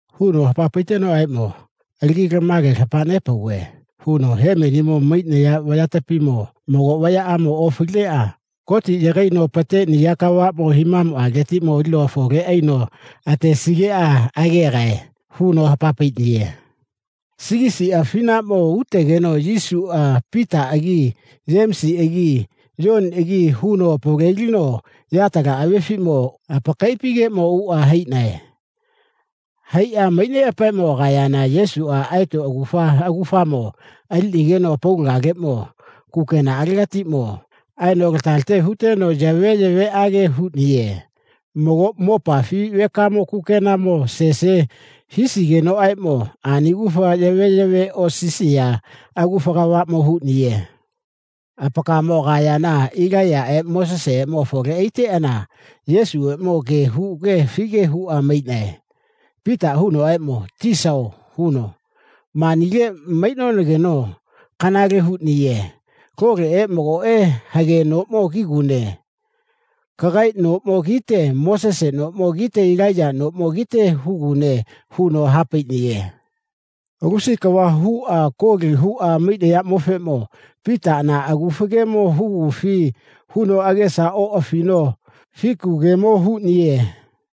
Huno hapa paitenoʼaeʼmo, Alagi lama gemo lapa nepauve, huno, hemenimo maiʼnaya vayapatiʼmo mago vayaʼamo ofaliʼneʼa Gotiʼa yagaino apateʼniya kavaʼmo himamuʼaletiʼmo alino afole aino atesigeʼa agegae, huno hapa paiʼniye. Sigisiʼa afinaʼmo utegeno Yesuʼa Pitaʼagi Yemisiʼagi Yoniʼagi huno apavalelinuno yatala avefiʼmo apakaiʼapigeʼmo uʼa haiʼnae. Haiʼa maiʼneʼapaeʼmo agayana Yesuʼa aeto agufa agufamo aliʼnigeno apaulagaleʼmo kukenaʼalegatiʼmo aeno lata late huteno yaveyaveʼage huʼniye. Mago ma mopafi vekamo kukenaʼamo sese hisigenoʼaeʼmo ani agufa yaveyave osisiya agufa kavaʼmo huʼniye. Apakaemo anakayana Ilaiyaʼe Moseseʼeʼmo afole aiteʼana Yesuʼeʼmo ge huge afige huʼa maiʼnae. Pitaʼa hunoʼaeʼmo, Tisao, huno, manile maiʼnonageno kanale huʼniye. Loleʼe magoʼe hage noʼmo kigune. Kagae noʼmo kite Mosese noʼmo kite Ilaiya noʼmo kite hugune, huno ha paiʼniye. Lusi kava huʼa koli huʼa maiʼnayaʼmofeʼmo Pitaʼa na agufa gemo hugufi, huno agesa oʼafino fiku gemo huʼniye.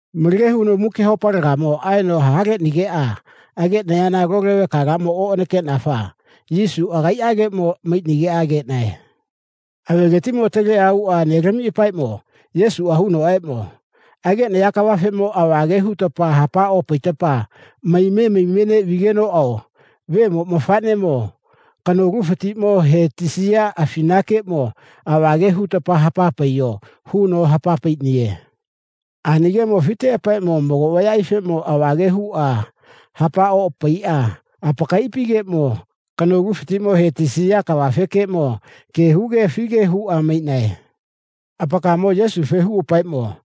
Malage huno muki haopalegamo aeno ha leʼnigeʼa ageʼnayana lole vekalaʼmo oʼanakeʼnafa Yesuʼa agaiʼageʼmo maiʼnigeʼa ageʼnae. Aveletiʼmo ataleʼa uʼa nelamiʼapaeʼmo Yesuʼa hunoʼaeʼmo, ageʼnaya kavafeʼmo ava ge hutapa hapa opaita maime maime neʼvigenoʼao Vemo mafaʼnemo kanolufatiʼmo he tisiya afinakeʼmo ava ge huta hapa paiyo, huno hapa paiʼniye. Ani gemo afiteʼapaeʼmo mago vayaʼaifeʼmo ava ge huʼa hapa opaiʼa apakaiʼapigeʼmo kanolufatiʼmo he tisiya kavafekeʼmo ge huge afige huʼa maiʼnae. Apakaemo Yesufeʼmo huʼapaeʼmo,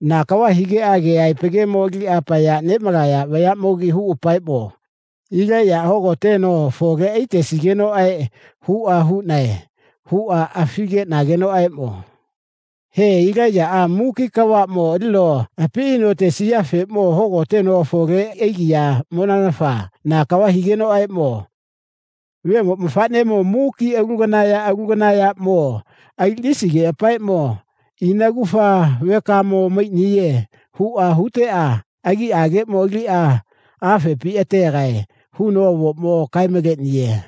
na kava higeʼa keʼaepa gemo aliʼa apaya neʼmalaya vayaʼmogi huʼapaeʼmo, Ilaiyaʼa hogoteno afole aitesigenoʼae, huʼa huʼnae, huʼa afigeʼnagenoʼaeʼmo, He, Ilaiyaʼa muki kavaʼmo alino api aino atesiyafeʼmo hogoteno afole aigiyaʼmonanafa na kava higenoʼaeʼmo, Vemo mafaʼnemoʼmo muki alu kana ya alu kana yaʼmo aliʼnisigeʼapaeʼmo, ina agufa vekamo maiʼniye, huʼa huteʼa agiʼaleʼmo aliʼa afepi ategae, huno avoʼmo kae maleʼniye.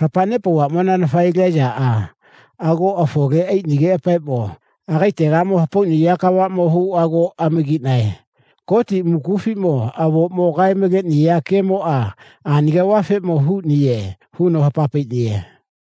Lapa nepauvaʼmonanafa Ilaiyaʼa ago afole aiʼnigeʼapaeʼmo agaetegamo hapauʼniya kavaʼmo huʼa ago amagiʼnae. Goti mukufiʼmo avoʼmo kae maleʼniya gemoʼa ani kavafeʼmo huʼniye, huno hapa paiʼniye.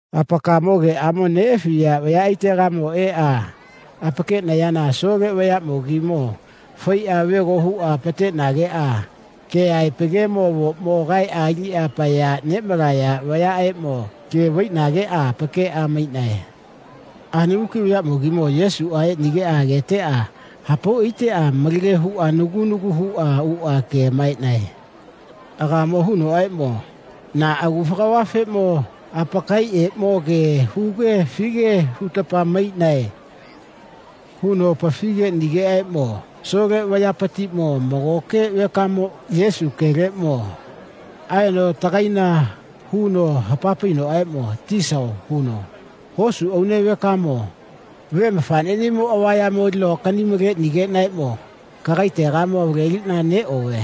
Apakaemo geʼamo neʼafiya vayaʼaitegamo eʼa apakeʼnayana asole vayaʼmogimo faiʼa vego huʼa apateʼnageʼa keʼaepa gemo avoʼmo kaeʼa aliʼa apaya neʼmalaya vayaʼeʼmo ke vaiʼnageʼa apakeʼa maiʼnae. Ani muki vayaʼmogimo Yesuʼa eʼnigeʼa ageteʼa hapau aiteʼa malage huʼa nagu nagu huʼa uʼa ke amamaeʼnae. Agaemo hunoʼaeʼmo, na agufa kavafeʼmo apakaeʼeʼmo ge huge afige hutapa maiʼnae, huno apafi geʼnigenoʼaeʼmo asole vayapatiʼmo magoke vekamoʼmo Yesu geʼaleʼmo aeno atagaina huno ha painoʼaeʼmo, Tisao, huno, hosu aune vekamoʼmo ve mafaʼneʼnimo avayamo alino akani maleʼnigeʼnaeʼmo kagaetegamo avaleliʼna neʼove.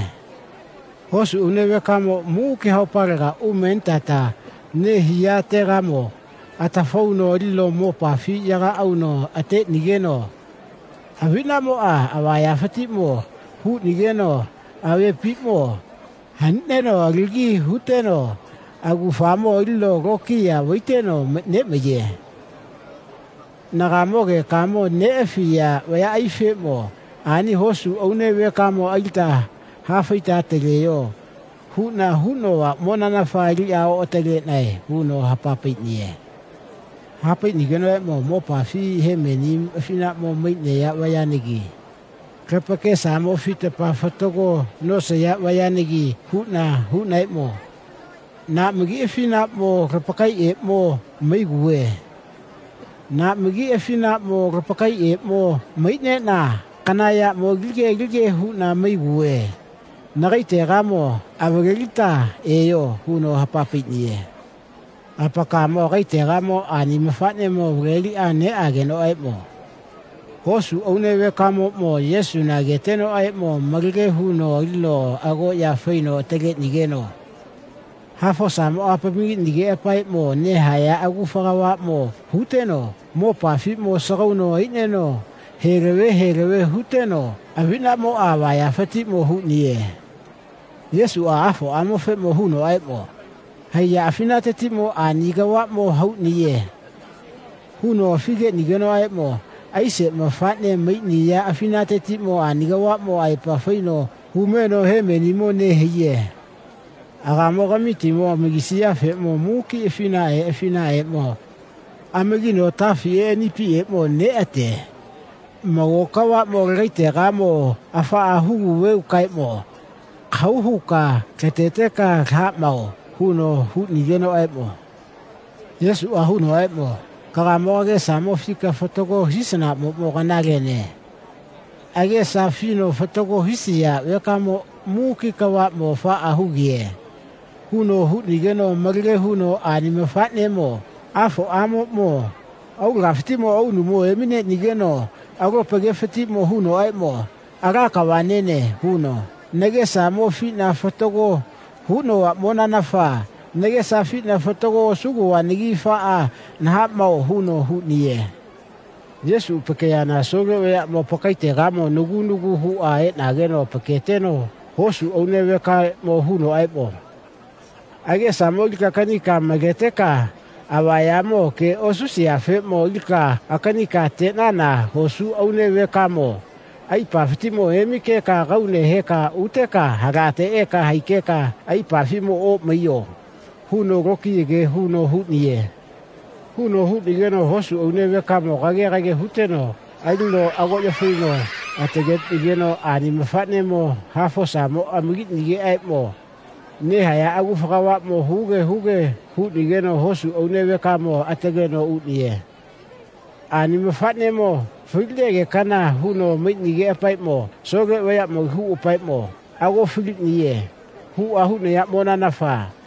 Hosu aune vekamoʼmo muki haopalega umenitata nehiyategamo atafauno alino mopafi yaga auno ateʼnigeno aviʼnaʼmoʼa avayafatiʼmo huʼnigeno avepiʼmo hanineno alagi huteno agufamo alino lokiya vaiteno neʼmaiye. Nagaemo gekamo neʼafiya vayaʼaifeʼmo, ani hosu aune vekamo alita hafaita ataleyo, huʼna huʼnovaʼmonanafa aliʼa oʼataleʼnae, huno ha paiʼniye. Ha paiʼnigenoʼaeʼmo, ma mopafiʼmo hemeni afinaʼmo maiʼnaya vayanagi lapakesamo afita fatago nosaya vayanagi huʼna huʼnaeʼmo, na magi afinaʼmo lapakaeʼeʼmo maiguve. Na magi afinaʼmo lapakaeʼeʼmo maiʼneʼna kana yaʼmo alige alige huʼna maiguve. Nagaetegamo avalelita eyo, huno hapa paiʼniye. Apakaemo agaetegamo ani mafaʼnemo avaleliʼa neʼagenoʼaeʼmo hosu aune vekamoʼmo Yesuna agetenoʼaeʼmo malage huno alino agoʼya faino ataleʼnigeno hafosamoʼa apamagiʼnigeʼapaeʼmo nehaya agufa kavaʼmo huteno mopafiʼmo asagauno aino heleve heleve huteno aviʼnaʼmoʼa avayafatiʼmo huʼniye. Yesuʼa afoʼamofeʼmo hunoʼaeʼmo, haiya afinatetiʼmo ani kavaʼmo huʼniye, huno afi geʼnigenoʼaeʼmo, aise mafaʼne maiʼniya afinatetiʼmo ani kavaʼmo aepa faino haume eno hemenimo nehaiye. Agaemo kamitimo amagisiyafeʼmo muki afinaʼae afinaʼaeʼmo amagino atafiʼe anipiʼeʼmo neʼate. Mago kavaʼmo lagaetegamo afaʼa huguvekaeʼmo kahau huka lateteka laha mao, huno huʼnigenoʼaeʼmo Yesuʼa hunoʼaeʼmo, kagaemo kagesamo afika fatago hisanaʼmoʼmo kanalene. Agesa afino fatago hisiya vekamoʼmo muki kavaʼmo afaʼa hugiye, huno huʼnigeno malage huno ani mafaʼnemo afoʼamoʼmo aulagafatiʼmo aunumo emineʼnigeno alopa gefatiʼmo hunoʼaeʼmo, Ala kava nene, huno, Nagesamo afiʼna fatago huʼnovaʼmonanafa nagesa afiʼna fatago osuʼnovanagi afaʼa naha mao, huno huʼniye. Yesuʼa apakeyana asole vayaʼmo apakaetegamo nagu nagu huʼa eʼnageno apaketeno hosu aune vekaeʼmo hunoʼaeʼmo, agesamo alika akani maleteka avayamo ge osisiyafeʼmo alika akanika ateʼnana hosu aune vekamo aipafatiʼmo emikeka kaune heka uteka halate eka haikeka aipafiʼmo oʼmaiyo, huno lokiya ge huno huʼniye. Huno huʼnigeno hosu aune vekamo kage kage huteno alino agoʼya faino ataleʼnigeno ani mafaʼnemo hafosamoʼa apamagiʼnigeʼaeʼmo nehaya agufa kavaʼmo huge huge huʼnigeno hosu aune vekamo ataleno uʼniye. Ani mafaʼnemo faligekana huno maiʼnigeʼapaeʼmo asole vayaʼmogi huʼapaeʼmo ago faliʼniye, huʼa huʼnayaʼmonanafa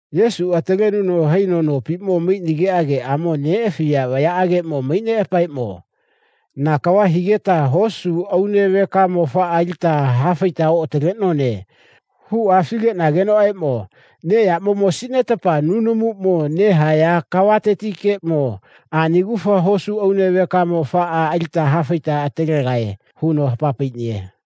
Yesuʼa atalenuno haino nopiʼmo maiʼnigeʼa geʼamo neʼafiya vayaʼageʼmo maiʼneʼapaeʼmo, na kava higeta hosu aune vekamo afaʼa alita hafaita oʼataleʼnone, huʼa afi geʼnagenoʼaeʼmo, neʼyaʼmo mosiʼnetapa nunumuʼmo nehaya kavatetikeʼmo ani agufa hosu aune vekamo afaʼa alita hafaita atalegae, huno hapa paiʼniye.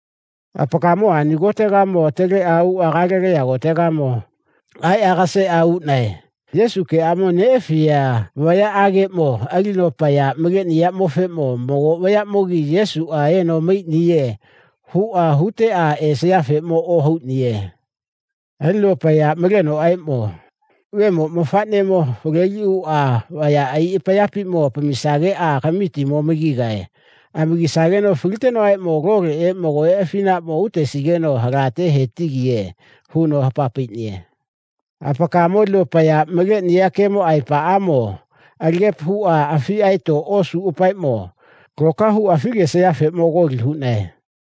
Apakaemo ani kotetiʼmo ataleʼuʼa Galeliya kotegamo aeʼa aga seʼa uʼnae. Yesuʼa geʼamo neʼafiya vayaʼageʼmo alino apaya maleʼniyaʼmofeʼmo mago vayaʼmogi Yesuʼa eno maiʼniye, huʼa huteʼa esayafeʼmo ohauʼniye. Alino apaya malenoʼaeʼmo, Vemo mafaʼnemo avaleliʼuʼa vayaʼai apayapiʼmo apamisageʼa kamitimo amagigae. Amagisageno falitenoʼaeʼmo loleʼe magoʼe afinaʼmo utesigeno halate he tigiye, huno hapa paiʼniye. Apakaemo alino apaya maleʼniya gemo aepaʼamo alagepa huʼa afiʼa aeto osuʼapaeʼmo loka huʼa afi gesayafeʼmo koli huʼnae.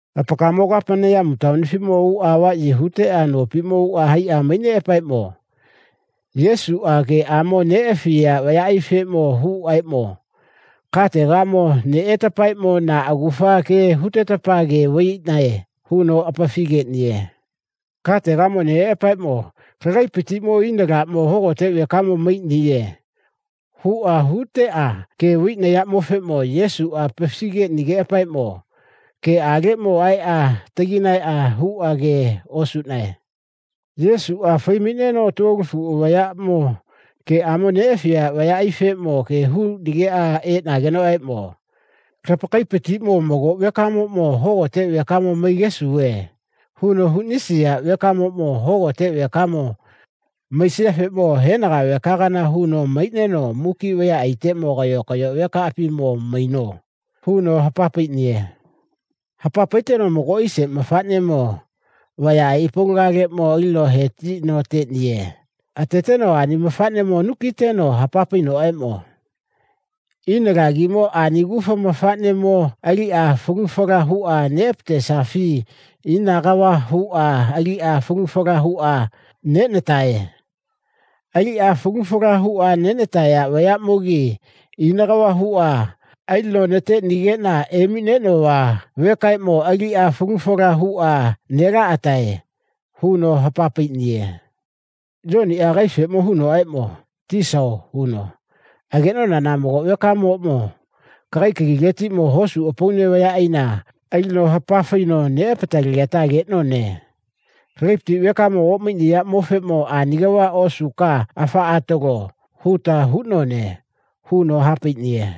Apakaemo Kapeneyamu taonifiʼmo uʼa avaʼyi huteʼa nopiʼmo uʼa haiʼa maiʼneʼapaeʼmo Yesuʼa geʼamo neʼafiya vayaʼaifeʼmo hunoʼaeʼmo, kategamo neʼetapaeʼmo na agufa gemo hutetapa ge vaiʼnae, huno apafi geʼniye. Kategamo neʼeʼapaeʼmo, lagaepatiʼmo ina laʼmo hogote vekamo maiʼniye, huʼa huteʼa ge vaiʼnayaʼmofeʼmo Yesuʼa apafi geʼnigeʼapaeʼmo geʼaleʼmo aeʼa atagaina huʼa ge osuʼnae. Yesuʼa fai maiʼneno tuolofuʼa vayaʼmo geʼamo neʼafiya vayaʼaifeʼmo ge huʼnigeʼa eʼnagenoʼaeʼmo, lapakaepatiʼmo mago vekamoʼmo hogote vekamo maigesuve, huno huʼnisiya vekamoʼmo hogote vekamo maisiyafeʼmo henaga vekagana huno maiʼneno muki vayaʼaiteʼmo kayo kayo vekaʼapimo maino, huno hapa paiʼniye. Hapa paiteno mago aise mafaʼnemo vayaʼai apaulagaleʼmo alino he tino ateʼniye. Ateteno ani mafaʼnemo anu kiʼneno hapa painoʼaeʼmo, Ina lagimo ani agufa mafaʼnemo aliʼa falu fala huʼa neʼatesafi ina kava huʼa aliʼa falu fala huʼa neʼnatae. Aliʼa falu fala huʼa neʼnataya vayaʼmogi ina kava huʼa alino nateʼnigeʼna emiʼneʼnova vekaʼeʼmo aliʼa falu fala huʼa nelaʼataʼae, huno hapa paiʼniye. Yoniʼa agaefeʼmo hunoʼaeʼmo, Tisao, huno, ageʼnonana mago vekamoʼmo kagikaletiʼmo hosu apaune vayaʼaina alino hapa faino neʼapatalegeta ageʼnone. Lagaepati vekamo oʼmaiʼniyaʼmofeʼmo ani kava osuka afaʼa atalo, huta huʼnone, huno ha paiʼniye.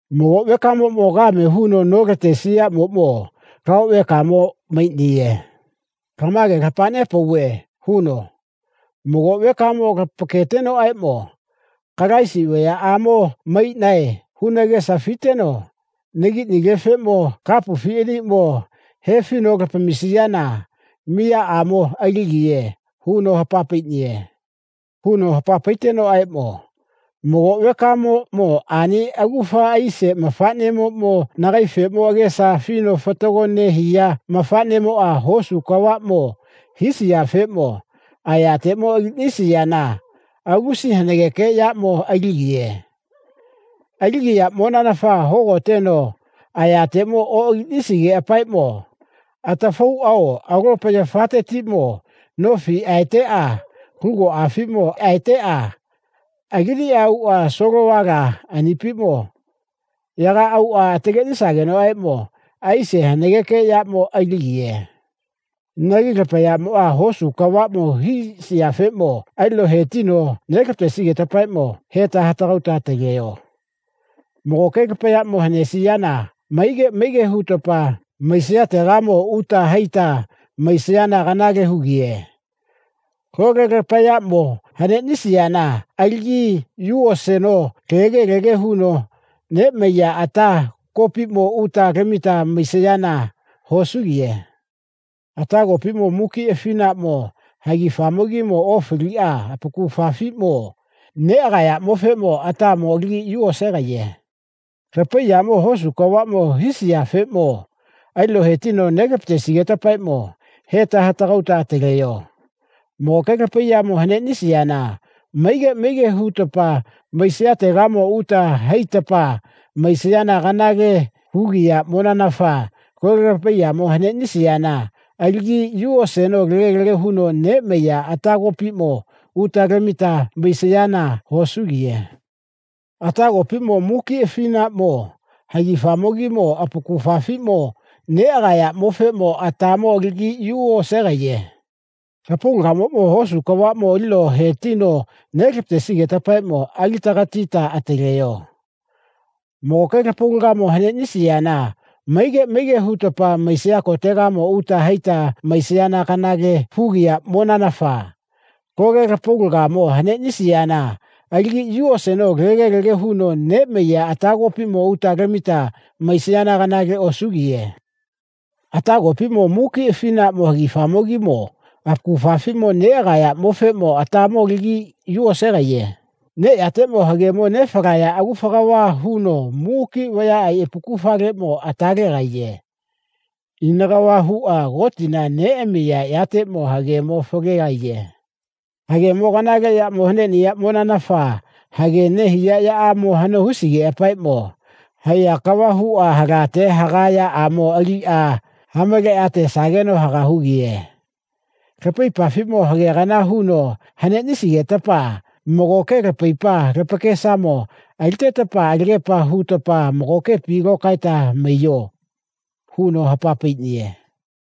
Mago vekamoʼmo kame huno nolatesiyaʼmoʼmo lao vekamo maiʼniye. Lama gemo lapa nepauve, huno, mago vekamoʼmo lapaketenoʼaeʼmo, Kalaisi vayaʼamo maiʼnae, huno agesa afiteno nagiʼnilefeʼmo kapufi aniʼmo hefino lapamisiyana miyaʼamo aligiye, huno hapa paiʼniye. Huno hapa paitenoʼaeʼmo, Mago vekamoʼmo ani agufa aise mafaʼnemoʼmo nagaefeʼmo agesa afino fatago nehiya mafaʼnemoʼa hosu kavaʼmo hisiyafeʼmo ayateʼmo aliʼnisiyana lusi hanageke yaʼmo aligiye. Aligiyaʼmonanafa hogoteno ayateʼmo oʼaliʼnisigeʼapaeʼmo atafauʼao alopa yafateʼmo nofi aeteʼa lugoʼafiʼmo aeteʼa alini uʼa solovala anipiʼmo yaga auʼa atalesagenoʼaeʼmo aise hanageke yaʼmo aligiye. Inagi lapayaʼmoʼa hosu kavaʼmo hisayafeʼmo alino he tino nelapatesigetapaeʼmo heta hatagauta ataleyo. Magoke lapayaʼmo haneʼnisiyana maige maige hutapa maisayategamo uta haita maisayana kanale hugiye. Lole lapayaʼmo haneʼnisiyana alagi yu oseno lege lege huno neʼmaiya ata kopiʼmo uta lamita maisayana hosugiye. Ata kopiʼmo muki afinaʼmo hagifamogimo ofaliʼa apakufafiʼmo negayaʼmofeʼmo atamo alagi yu osegaiye. Lapaiyaʼmoʼmo hosu kavaʼmo hisayafeʼmo alino he tino nelapatesigetapaeʼmo heta hatagauta ataleyo. Magoke lapaiyamo haneʼnisiyana maige maige hutapa maisayategamo uta haitapa maisayana kanale hugiyaʼmonanafa lole lapaiyamo haneʼnisiyana alagi yu oseno lege lege huno neʼmaiya ata kopiʼmo uta lamita maisayana hosugiye. Ata kopiʼmo muki afinaʼmo hagifamogimo apakufafiʼmo negayaʼmofeʼmo atamo alagi yu osegaiye. Lapaulagamoʼmo hosu kavaʼmo alino he tino nelapatesigetapaeʼmo alita katita ataleyo. Magoke lapaulagamo haneʼnisiyana maige maige hutapa maisayategamo uta haita maisayana kanale hugiyaʼmonanafa lole lapaulagamo haneʼnisiyana alagi yu oseno lege lege huno neʼmaiya ata kopiʼmo uta lamita maisayana hosugiye. Ata kopiʼmo muki afinaʼmo hagifamogimo apakufafiʼmo negayaʼmofeʼmo atamo alagi yu osegaiye. Neʼyateʼmo hagemo nefalaya agufa kava huno muki vayaʼai apakufaleʼmo ata legaiye. Ina kava huʼa Gotina neʼamiya yateʼmo hagemo falegaiye. Hagemo kanale yaʼmo haneʼniyaʼmonanafa haga nehiya yaʼamo hano hisigeʼapaeʼmo haiya kava huʼa halate haga yaʼamo aliʼa hamaleʼa atesageno haga hugiye. Lapaipafiʼmo hagekana huno haneʼnisigetapa magoke lapaipa lapakesamo aliteta alagepa hutapa magokepi lokaeta maiyo, huno hapa paiʼniye.